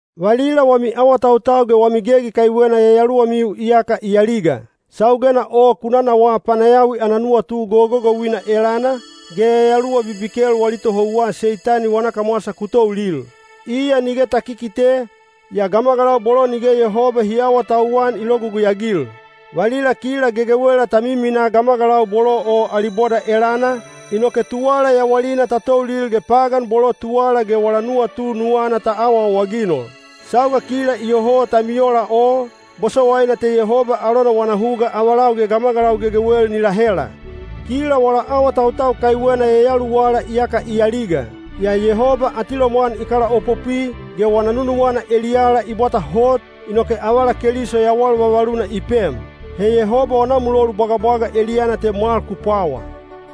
Valila wami awatautau ge wami gegi kaiwena yayaluwamiu iyaka i aliga. Saugena o ku nanawaa panayawi ana nuwatu gogogouina elana, ge yayaluwa bibikel wali tohouwa Seitani wana kamwasa ku toulil. Iya nige ta kikite, yaa gamagalau bolo nige Yehoba hi aawatauwan i logugui-agil. Valila kila gegewela ta miminaa gamagalau bolo o ali boda elana, inoke tuwala yawalina ta toulil ge pagan bolo tuwala ge wala nuwatu nuwana ta awaawaginol. Sauga kila iyoho ta miola o, bosowaina te Yehoba alona wana huga avalau ge gamagalau gegewel ni lahela. Kila wala awatautau kaiwena yayaluwala iyaka i aliga. Yaa Yehoba atilomwan i kalaopopwi, ge wana nunuwana eliyala i bwata hot, inoke avala Keliso yawal vavaluna i pem. He Yehoba wana mulolu bwagabwaga eliyana te mwal ku pwawa.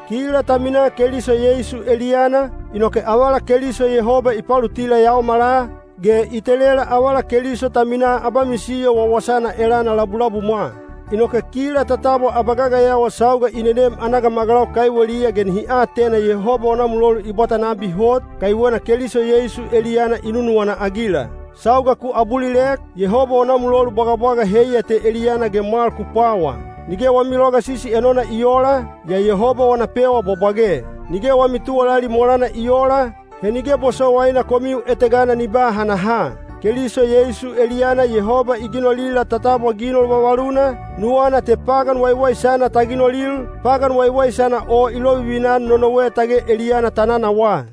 Kila ta minaa Keliso Yeisu eliyana, inoke avala Keliso Yehoba i palutila yaomala, ge i telela avala Keliso ta minaa abamisiyo wawasana elana labulabumwa. Inoke kila ta tabwa abagagayawa sauga i nenem ana gamagalau kaiweliya ge nihi atena Yehoba wana mulolu i bwata nabi hot, kaiwena Keliso Yeisu eliyana i nunuwana-agila. Sauga ku abulilek, Yehoba wana mulolu bwagabwaga heiya te eliyana ge mwal ku pwawa. Nige wami logasisi enona i oola, yaa Yehoba wana pewa bwabwage. Nige wami tuwalali molana i oola, he nige bosowaina komiu etegana ni ba hanaha. Keliso Yeisu eliyana Yehoba i ginolila ta tabwa ginol vavaluna, nuwana te pagan waiwaisana ta ginolil, pagan waiwaisana o i lovivina-an nonowe tage eliyana ta nanawaa.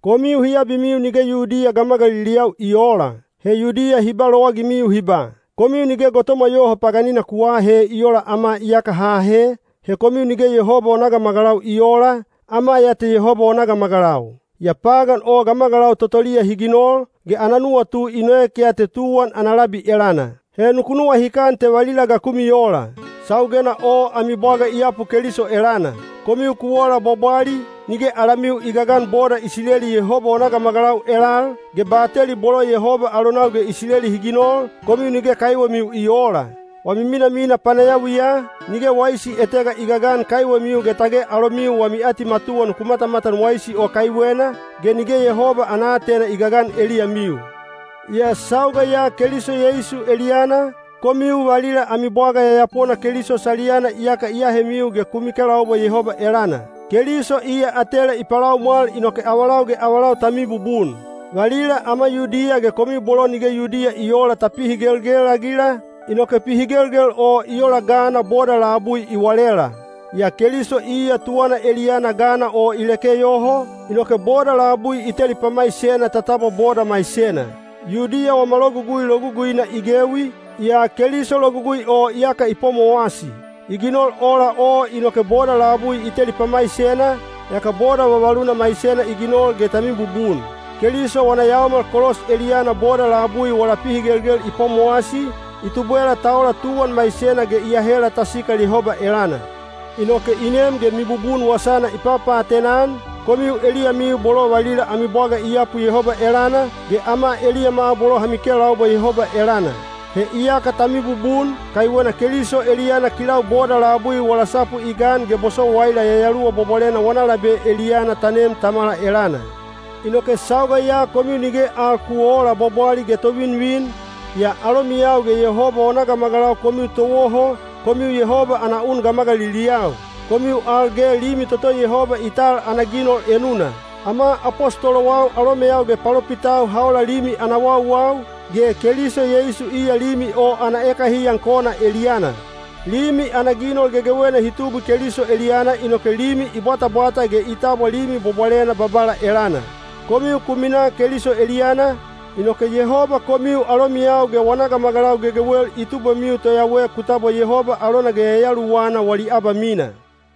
Komiu hi abimiu nige Yudiya gamagaliliyau i oola. He Yudiya hi ba lowagimiu hi ba, “Komiu nige gotomwa yoho paganina ku aahe i oola ama iyaka ha ahe, he komiu nige Yehoba wana gamagalau i oola, ama ya te Yehoba wana gamagalau.” (Yaa pagan o gamagalau totoliya hi ginol, ge ana nuwatu i noek ya te tuwan ana labi elana.) He nuku nuwahikan te valila ga ku miola. Saugena o ami bwaga i yapu Keliso elana. Komiu ku ola bwabwali, nige alamiu i gagan boda Isileli Yehoba wana gamagalau elal, ge bateli bolo Yehoba alonau ge Isileli hi ginol, komiu nige kaiwemiu i oola. Wami minamina panayawiya, nige waisi etega i gagan kaiwemiu ge tage alomiu wami atimatuwa nuku matamatan waisi o kaiwena, ge nige Yehoba ana aatena i gagan eliyamiu. Yaa sauga ya Keliso Yeisu eliyana, komiu valila ami bwaga yayapona Keliso saliyana iyaka i ahemiu ge ku mikelaubwa Yehoba elana. Keliso iya atela i palaumwal inoke avalau ge avalau ta mibubun. Valila ama Yudiya ge komiu bolo nige Yudiya i oola ta pihigelgel-agila, inoke pihigelgel o i ola gana boda labui i walela. Yaa Keliso iya tuwana eliyana gana o i leke yoho, inoke boda labui i teli pamaisena ta tabwa boda maisena. Yudiya wama Logugui loguguina i gewi, yaa Keliso Logugui o iyaka i pwamowasi. I ginol ola o inoke boda labui i teli pamaisena, yaka boda vavaluna maisena i ginol ge ta mibubun. Keliso wana yaomal kolos eliyana boda labui wala pihigelgel i pwamowasi, i tubwela ta ola tuwan maisena ge i ahela ta sikal Yehoba elana. He iya i nem ge mibubun wasana i papaatena-an, komiu eliyamiu bolo valila ami bwaga i yapu Yehoba elana, ge ama eliyama bolo ha mikelaubwa Yehoba elana. He iyaka ta mibubun, kaiwena Keliso eliyana kilau boda labui wala sapu i gan ge bosowaila Yayaluwa Bwabwalena wana labe eliyana ta nem Tamala elana. Inoke sauga ya komiu nige al ku oola bwabwali ge tovinvin, yaa alomiyau ge Yehoba wana gamagalau komiu towoho, komiu Yehoba ana un gamagaliliyau. Komiu al ge limi toto Yehoba i tal ana ginol enuna. Ama apostolowau alomeyau ge palopitau ha ola limi ana wauwau, ge Keliso Yeisu iya limi o ana ekahiyan kona eliyana. Limi ana ginol gegewena hi tubwi Keliso eliyana inoke limi i bwatabwata ge i tabwa limi bwabwalena Babala elana. Komiu ku minaa Keliso eliyana, inoke Yehoba komiu alomiyau ge wana gamagalau gegewel i tubwemiu toyawe ku tabwa Yehoba alona ge Yayaluwana wali abamina.